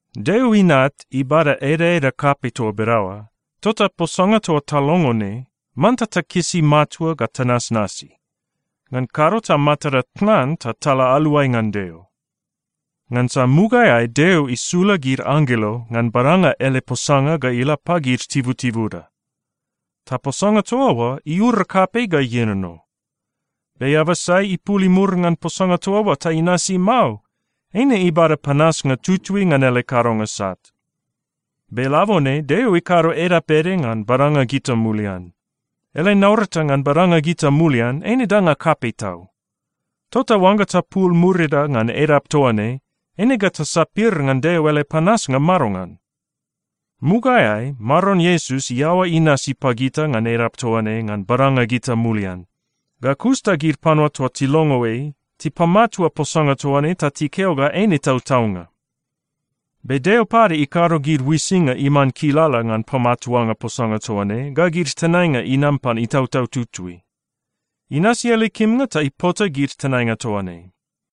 Deo Inat ibada edaeda kapei toa bedaoa, tota posanga toa talongo ne, manta takisi matua ga tanasnasi. Ngan kado ta matada tnan ta tala aluai ngan Deo. Ngansa mugaeai Deo isula gid anggelo ngan badanga ele posanga ga ila pagid tibutibuda. Ta posanga toa oa iura kapei ga ienono. Be eaba sai ipul imur ngan posanga toa oa ta inasi mao, eine ibada panasnga tutui ngan ele kadonga sat. Be labone Deo ikado edap ede ngan badanga gita mulian. Ele naurata ngan badanga gita mulian eine danga kapei tau. Tota oangga tapul murida ngan edap toa ne, eine ga tasapir ngan Deo ele panasnga madongan? Mugaeai Maron Iesus iaoa inasi pagita ngan edap toa ne ngan badanga gita mulian. Ga kus ta gid panua toa tilongo ei, tipamatua posanga toa ne ta tikeo ga eine tautaunga. Be Deo pade ikado gid uisinga iman kilala ngan pamatuanga posanga toa ne, ga gid tenainga inam pan Itautau Tutui. Inasi ele kimnga ta ipota gid tenainga toa ne.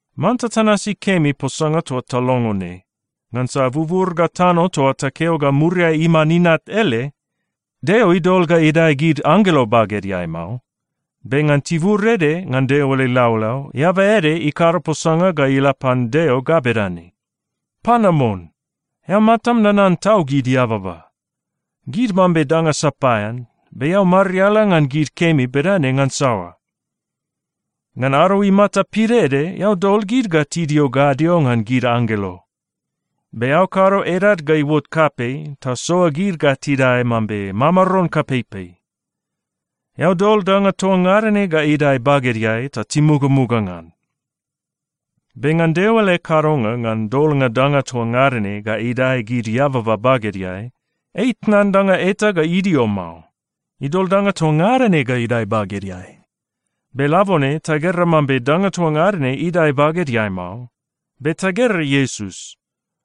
Manta tanasi kemi posanga toa talongo ne, ngansa bubur ga tano toa takeo ga muriai iman Inat ele, Deo idol ga idae gid anggelo bagedeai mao. Be ngan tibur ede ngan Deo ele laulau, eaba ede ikado posanga ga ila pan Deo ga bedane, “Panamon! Eao matam nanan tau gid eababa! Gid mambe danga sapaean, be eao mariala ngan gid kemi bedane ngan saoa? Ngan ado imata pidaede, eao dol gid ga tidio gadio ngan gid anggelo. Be eao kado edad ga iuot kapei ta soa gid ga tidae mambe mamaron kapeipei. Eao dol danga toa ngada ne ga idae bagedeai ta timugamuga ngan.” Be ngan Deo ele kadonga ngan dolnga danga toa ngada ne ga idae gid eababa bagedeai, ei itnan danga eta ga idio mao. Idol danga toa ngada ne idae bagedeai. Be labone tagera mambe danga toa ngada ne idae bagedeai mao. Be tagera Iesus.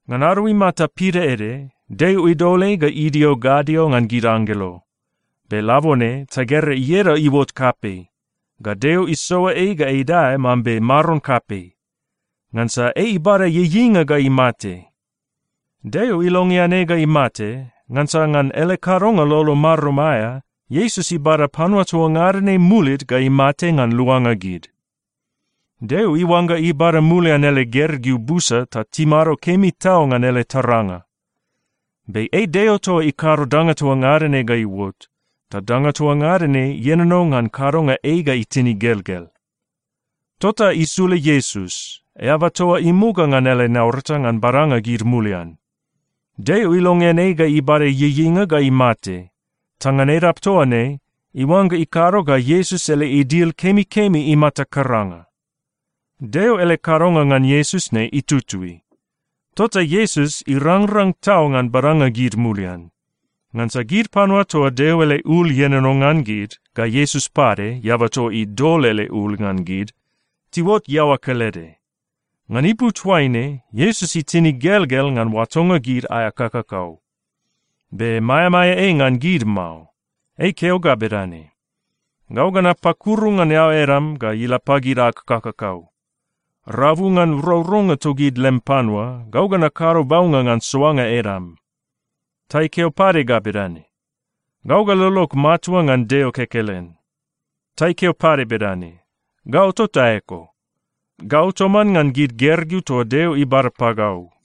Ngan ado imata pidaede, Deo idol ei ga idio gadio ngan gid anggelo. Be labone tagera ieda iuot kapei, ga Deo isoa ei ga idae mambe maron kapei, ngansa ei ibada ieieinga ga imate. Deo ilongean ei ga imate ngansa ngan ele kadonga lolo marum aea, Iesus ibada panua toa ngada ne mulid ga imate ngan luanga gid. Deo iuangga ibada mulian ele gergeu busa ta timado kemi tau ngan ele taranga. Be ei Deo toa ikado danga toa ngada ne ga iuot, ta danga toa ngada ne ienono ngan kadonga ei ga itin igelgel. Tota isula Iesus, eaba toa imuga ngan ele naurata ngan badanga gid mulian. Deo ilongean ei ga ibada ieieinga ga imate, ta ngan edap toa ne, iuangga ikado ga Iesus ele idil kemikemi imata karanga. Deo ele kadonga ngan Iesus ne itutui. Tota Iesus irangrang tau ngan badanga gid mulian. Ngansa gid panua toa Deo ele ul ienono ngan gid ga Iesus pade, eaba toa idol ele ul ngan gid, tiuot iaoa kelede. Ngan ipu toaine, Iesus itin igelgel ngan oatonga gid aea kakakau, be maeamaea ei ngan gid mao. Ei ikeo ga bedane, “Gau ga napakuru ngan eao edam ga ila pagid ag kakakau. Rabu ngan rourounga togid lem panua, gau ga nakado baunga ngan soanga edam.” Ta ikeo pade ga bedane, “Gau ga lolog matua ngan Deo kekelen.” Ta ikeo pade bedane, “Gau tota eko. Gau toman ngan gid gergeu toa Deo ibada pagau.”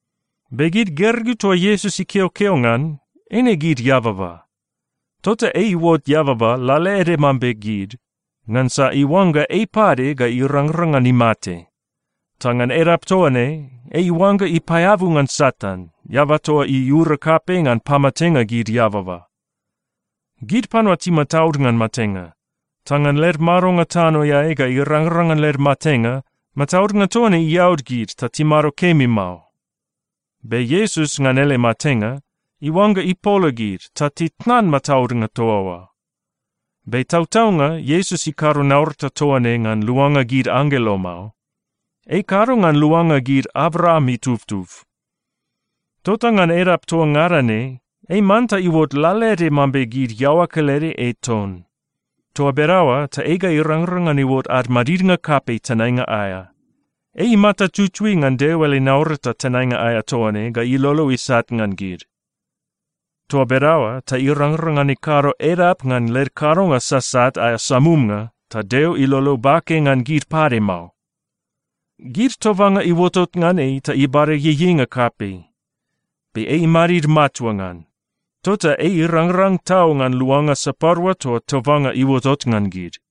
Be gid gergeu toa Iesus ikeokeo ngan, eine gid eababa. Tota ei iuot eababa lalaede mambe gid, ngansa iuangga ei pade ga irangrang ngan imate. Ta ngan edap toa ne, ei iuangga ipaeabu ngan Satan, eaba toa iura kapei ngan pamatenga gid eababa. Gid panua timataud ngan matenga. Ta ngan led madonga tanoeai ga irangrang ngan led matenga, mataudnga toa ne iaud gid ta timado kemi mao. Be Iesus, ngan ele matenga, iuangga ipola gid ta titnan mataudnga toa oa. Be tautaunga Iesus ikado naurata toa ne ngan luanga gid anggelo mao. Ei ikado ngan luanga gid Abraam itubtub. Tota ngan edap toa ngada ne, ei manta iuot lalaede mambe gid iaoa kelede ei ton. Toa bedaoa ta ei ga irangrang ngan iuot ad madidnga kapei tenainga aea. Ei imata tutui ngan Deo ele naurata tenainga aea toa ne ga ilolo isat ngan gid. Toa bedaoa ta irangrang ngan ikado edap ngan led kadonga sasat aea samumnga ta Deo ilolo bake ngan gid pade mao. Gid tobanga iuotot ngan ei ta ibada ieieinga kapei, be ei imadid matua ngan. Tota ei irangrang tau ngan luanga sapadua toa tobanga iuotot ngan gid.